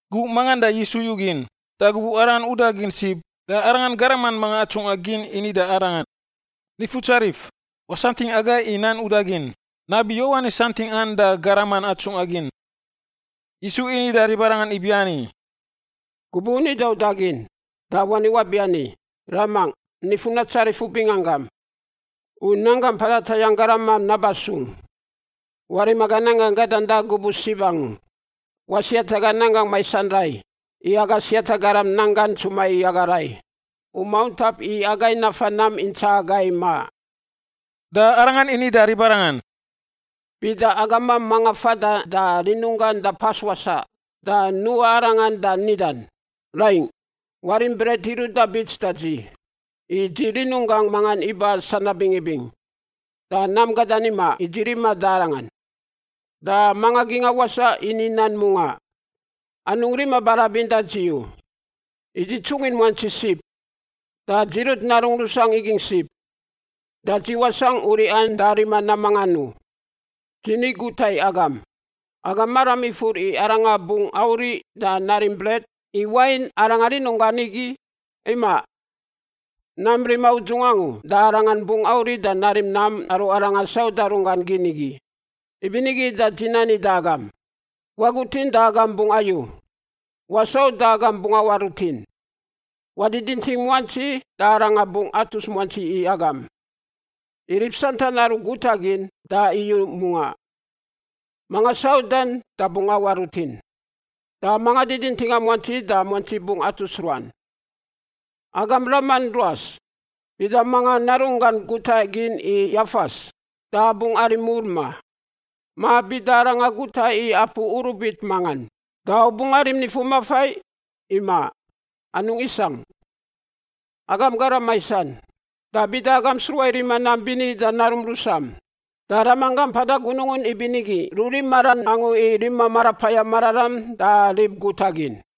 Gubuꞌ mangan da Yisu yugin, da gubuꞌ Arangan udagin sib, da Arangan garaman atsungꞌa gin mangan ini da Arangan, “Nifutsarif, wasantingꞌ agai i nan udagin, nabi Yowanis santingꞌan da garaman atsungꞌa gin.” Yisu ini da ribarangan ibiani, “Gubuꞌ u nida udagin, da wani wabiani, ‘Ramangꞌ, nifun natsarif u binganggam. U nanggam mpada tayangꞌ garamam naba sung. Warim aga nanggangꞌ gadan da gubuꞌ sib angu. Wasiat aga nanggangꞌ maisan rai i aga siata garam nanggan ntsuma i agai rai. U mauntap i agai nafa nam intsaꞌa agai maꞌ.’” Da Arangan ini da ribarangan, “Bida agamam mangan fada da rinunggan da pas wasaꞌ da nuꞌa arangan da nidan, ‘Raingꞌ, warim bret iruꞌ da bits da dzi, i dzi rinunggangꞌ mangan iba sanab bingibing, da nam gadan imaꞌ i dzi riman da arangan.’ Da manga gingꞌa wasaꞌ ini nan mungaꞌ, ‘Anungꞌ rima barabin da dzi u. I dzi tsungin muantsi sib, da dzi rut narungꞌ rusangꞌ igingꞌ sib. Da dzi wasangꞌ uriꞌan da rima nam mangan u.’ Dzi ni guta i agam, agam maram ifur i arangan bungꞌ auriꞌ da narim bret, i wain arangan rinunggan igi? Imaꞌ. Nam rima udzungꞌ angu da arangan bungꞌ auriꞌ da narim nam aru aranga sauda runggan gin igi. Ibinigi da dzi nani da agam: wagutin da agam bungꞌ ayu; wasau da agam bungꞌ awaꞌ rutin; wadidinting muantsi da Arangan bungꞌ atus muantsi i agam. I rib santan aru guta gin da iyu mungaꞌ; manga saudan da bungꞌ awaꞌ rutin; da manga didintinga muantsi da muantsi bungꞌ atus ruan. Agam raman ruas, bida mangan narunggan guta gin i yafas da bungꞌ arim mur, ma? Ma bida aranga guta i apu urubit mangan da u bungꞌ arim nifumafai? Imaꞌ, anungꞌ isangꞌ. Agam garam maisan, da bida agam sruꞌa i rima nam bini da narum rusam, da Ramanggam mpada gunungun ibinigi rurim maran angu i rima Marapayam Mararam da rib guta gin.”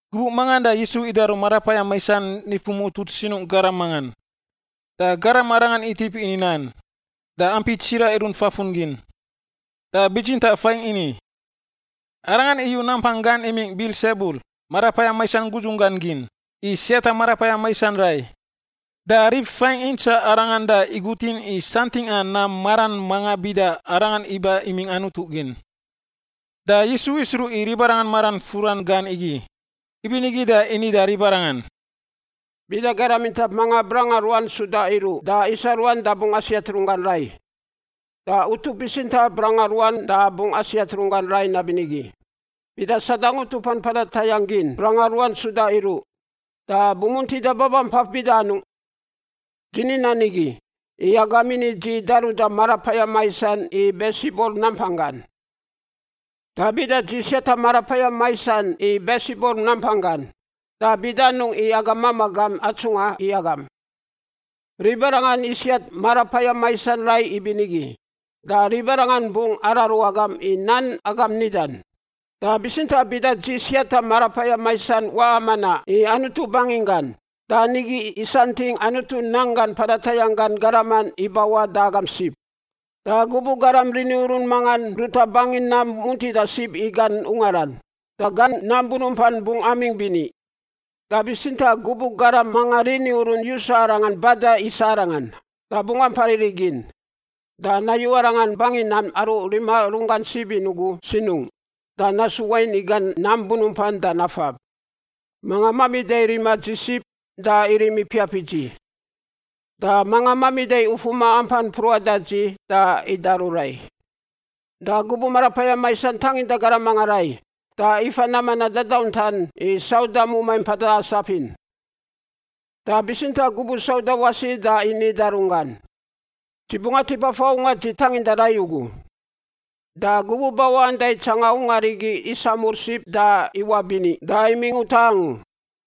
Gubuꞌ mangan da Yisu idaru marapayam maisan nifu mutut sinungꞌ garam mangan, da garam arangan itip ini nan, da ampi tsiraꞌ irunt fafun gin. Da bitsintaꞌ faingꞌ ini, “Arangan iyu nampang gan imingꞌ Bilsebul, marapayam maisan gudzun gan gin, i siata marapayam maisan rai.” Da rib faingꞌ intsaꞌ Arangan da igutin i santingꞌa nam maran mangan bida Arangan iba imingꞌ Anutu gin. Da Yisu isruꞌ i ribarangan maran furan gan igi, ibinigi da ini da ribarangan, “Bida garam intap mangan branga ruan suda iruꞌ da isa ruan da bungꞌ asiat runggan rai, da utup bitsintaꞌ branga ruan da bungꞌ asiat runggan rai nabinigi. Bida Sadang utupan mpada tayangꞌ gin branga ruan suda iruꞌ, da bumuntida babampaf bida anungꞌ? Dzi ni nan igi, i agam ini dzi daruda marapayam maisan i Bilsebul nampang gan. Da bida dzi siata marapayam maisan i Bilsebul nampang gan, da bida anungꞌ i agam mamaꞌ gam atsungꞌa i agam? Ribarangan isiat marapayam maisan rai ibinigi da ribarangan bungꞌ araru agam i nan agam nidan. Da bitsintaꞌ bida dzi siata marapayam maisan waꞌa manaꞌ i Anutu banginggan, da nigi isantingꞌ Anutu nanggan mpada tayangꞌ gan garaman ibawaꞌ da agam sib. “Da gubuꞌ garam rini urun mangan ruta bangin nam muntida sib i gan ungaran, da gan nam bunumpan bungꞌ amingꞌ bini. Da bitsintaꞌ, gubuꞌ garam mangan rini urun yusa arangan bada isa arangan, da bungꞌ ampa riri gin, da nayu arangan bangi nam aru rima runggan sib in ugu sinungꞌ, da nasu wain i gan nam bunumpan da nafab. “Manga mamida rima dzi sib, da irim ipiap i dzi, da manga mamida ufuma ampan mpruꞌan da dzi, da idaru rai. “Da gubuꞌ marapayam maisan tanginda garam mangan rai, da ifa nam manaꞌ dadauntan i sauda mumai mpada asap in. Da bitsintaꞌ, gubuꞌ sauda wasi da ini da runggan, ‘Dzi bungꞌ atip afa ungar dzi tanginda rai ugu.’ Da gubuꞌ bawaꞌan da itsangan ungar igi isamur sib da iwaꞌ bini da imingꞌ utaꞌ angu.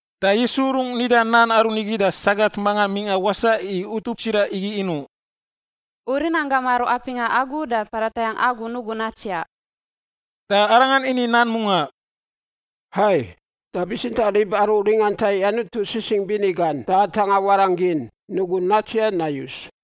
Da Yisu rungꞌ nida nan aru nigi da sagat mangan mingꞌa wasaꞌ i utup tsiraꞌ igi inuꞌ, “U rinanggam aru apingꞌa agu da mpada tayangꞌ agu nugun natsiaꞌ!” Da Arangan ini nan mungaꞌ, “Hai, da bitsintaꞌ rib aru ringanta i Anutu sisingꞌ bini gan da atangꞌa warangꞌ gin nugun natsiaꞌ nayus.”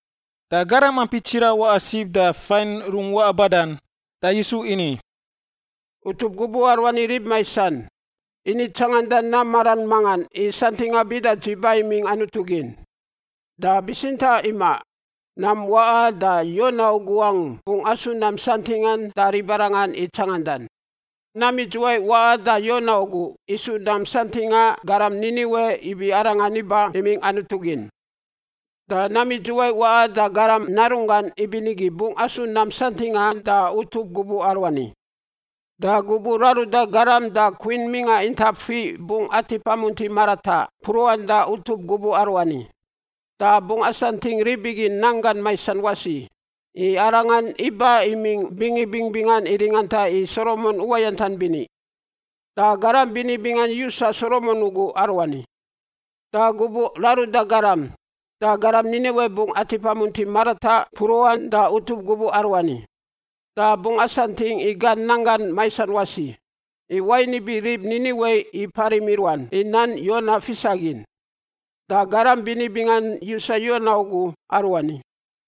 Da garam ampi tsiraꞌ waꞌa sib da fain rungꞌ waꞌa badan, da Yisu ini, “Utup gubuꞌ aruani rib maisan. Ini tsanganda nam maran mangan i santingꞌa bida dzi ba imingꞌ Anutu gin. Da bitsintaꞌ, imaꞌ, nam waꞌan da Yona ugu angu bungꞌ asu nam santingꞌan da ribarangan i tsangandan. Nam idzuwai waꞌan da Yona ugu isu nam santingꞌa garam Niniwe ibi arangan iba imingꞌ Anutu gin, da nam idzuwai waꞌan da Garam Narunggan ibinigi bungꞌ asu nam santingꞌan da utup gubuꞌ aruani. Da gubuꞌ raruda garam da Kwin mingꞌa intap fiꞌ bungꞌ atip amunti marataꞌ mpruꞌan da utup gubuꞌ aruani, da bungꞌ asantingꞌ rib igi nanggan maisan wasi, i arangan iba imingꞌ bingibing bingan i ringanta i Solomon uwayantan bini. Da garam bini bingan yusa Solomon ugu aruani. Da gubuꞌ raruda garam da garam Niniwe bungꞌ atip amunti marataꞌ mpruꞌan da utup gubuꞌ aruani, da bungꞌ asantingꞌ i gan nanggan maisan wasi, i wain ibi rib Niniwe iparim i ruan i nan Yona fisagin, da garam bini bingan yusa Yona ugu aruani.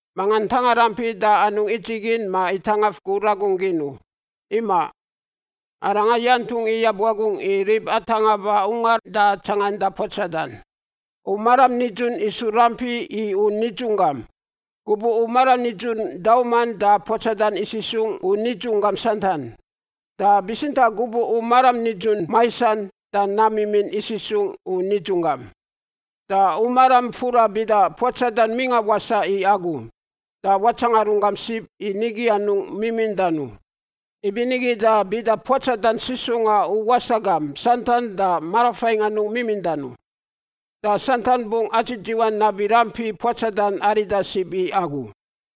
“Manga tanga rampi da anungꞌ idzigin ma itangaf gur ragun gin u. Imaꞌ; arangan yantungꞌ iyab wagungꞌ i rib atangꞌa ba ungar da tsanganda puatsadan. U maram nidzun isu rampi i u nidzunggam. Gubuꞌ u maram nidzun dauman da puatsadan isisungꞌ u nidzunggam santan, da bitsintaꞌ gubuꞌ u maram nidzun maisan da nam mimin isisungꞌ u nidzunggam. Da u maram fura bida puatsadan mingꞌa wasaꞌ i agu, da watsanga runggam sib i nigi anungꞌ mimindan u. Ibinigi da bida puatsadan sisungꞌa u wasaꞌ gam santan da marafaingꞌ anungꞌ mimindan u, da santan bungꞌ adzidziwan nabi rampi puatsadan arida sib i agu.”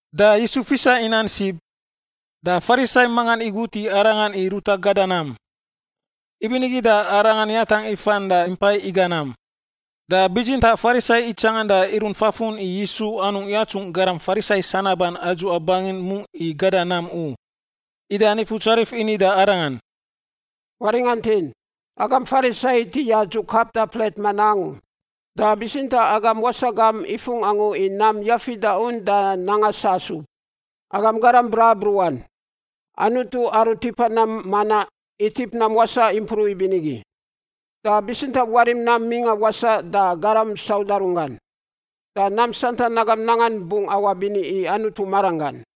Da Yisu fisa i nan sib, da Farisai mangan igut i Arangan i ruta gada nam. Ibinigi da Arangan yatangꞌ ifan da impai iga nam. Da bitsintaꞌ Farisai itsangan da irunt fafun i Yisu anungꞌ yatsungꞌ garam Farisai sanaban adzuꞌa bangin mungꞌ i gada nam u. Ida Nifutsarif ini da arangan, “Waringantin. Agam Farisai iti yadzuꞌ kap da plet manaꞌ angu, da bitsintaꞌ agam wasaꞌ gam ifungꞌ angu i nam yafida un da nanga sasub. Agam garam brabruꞌan! Anutu aru tipa nam manaꞌ, itip nam wasaꞌ impruꞌ ibinigi. Da bitsintaꞌ warim nam mingꞌa wasaꞌ da garam sauda runggan, da nam santan agam nangan bungꞌ awaꞌ bini i Anutu maranggan.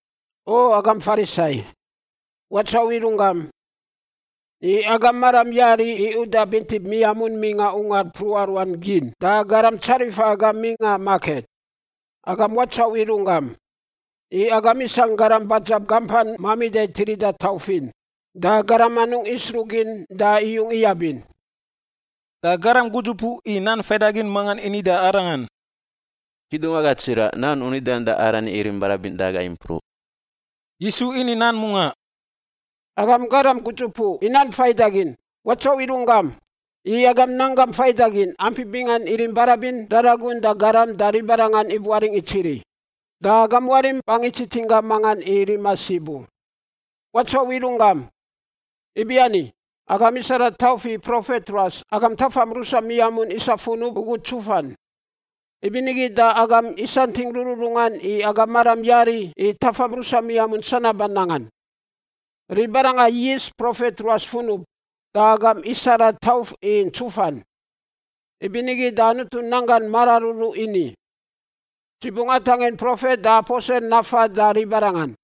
O agam Farisai, watsauꞌ i runggam! I agam maram yari i uda bintip miamun mingꞌa ungar mpruꞌa ruan gin da garam tsarifa agam mingꞌa maket. Agam watsauꞌ i runggam! I agam isangꞌ garam badzab gampan mamida tirida tauf in da garam anungꞌ isruꞌ gin da iyung iyab in.” Da garam gudzupuꞌ i nan faidagin mangan ini da Arangan, “Kidungwaga tsiraꞌ, nan u nidan da arani irim barabin da agai impruꞌ.” Yisu ini nan mungaꞌ, “Agam garam gudzupuꞌ i nan faidagin, watsauꞌ i runggam! I agam nan gan faidagin ampi bingan irim barabin raragun da garam da ribarangan ibuaringꞌ itsiri. Da agam warim bangi tsitsin gam mangan i rima sib u. Watsauꞌ i runggam! Ibiani, agam isara tauf i profet ruas agam tafam rusam miamun isa funub ugu ntsufan. Ibinigi da agam isantingꞌ rururungan i agam maram yari i tafam rusam miamun sanaban nangan; ribarangan yis profet ruas funub da agam isara tauf i ntsufan. Ibinigi da Anutu nan gan mararuru ini, ‘Dzi bungꞌ atangin profet da aposel nafan da ribarangan,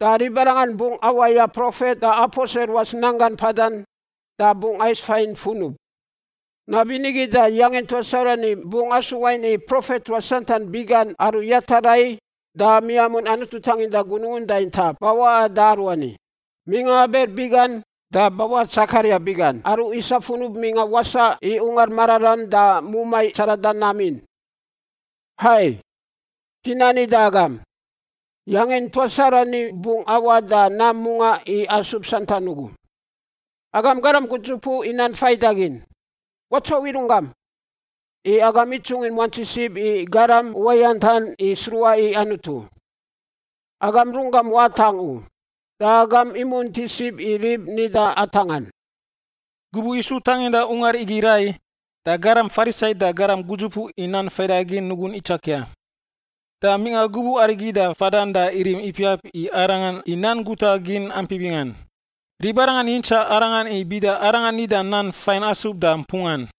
da ribarangan bungꞌ awaya profet da aposel ruas nanggan mpadan da bungꞌ ais faingꞌ funub.’ Nabinigi da yangin tuas arani bungꞌ asu wain i profet ruas santan biꞌ gan aru yata rai da miamun Anutu tanginda gunungun da intap bawaꞌan da aruani, mingꞌa Abel biꞌ gan da bawaꞌa Tsekaria biꞌ gan aru isa funub mingꞌa wasaꞌ i Ungar Mararam da mumai tsarada nam in. Hai, dzi nani da agam, yangin tuas aruani bungꞌ awaꞌ da nam mungaꞌ i asub santan ugu. “Agam garam gudzupuꞌ i nan faidagin, watsauꞌ i runggam! I agam itsungin muantsi sib i garam uwayantan i sruꞌa i Anutu. Agam runggam watangꞌ u, da agam imunti sib i rib nida atangꞌan.” Gubuꞌ Yisu tanginda ungar igi rai, da garam Farisai da garam gudzupuꞌ i nan faidagin nugun itsakia, da mingꞌa gubuꞌ arigi da fadan da irim ipiap i Arangan i nan guta gin ampi bingan. Ribarangan yintsaꞌ Arangan i bida Arangan nida nan fain asub da mpungan.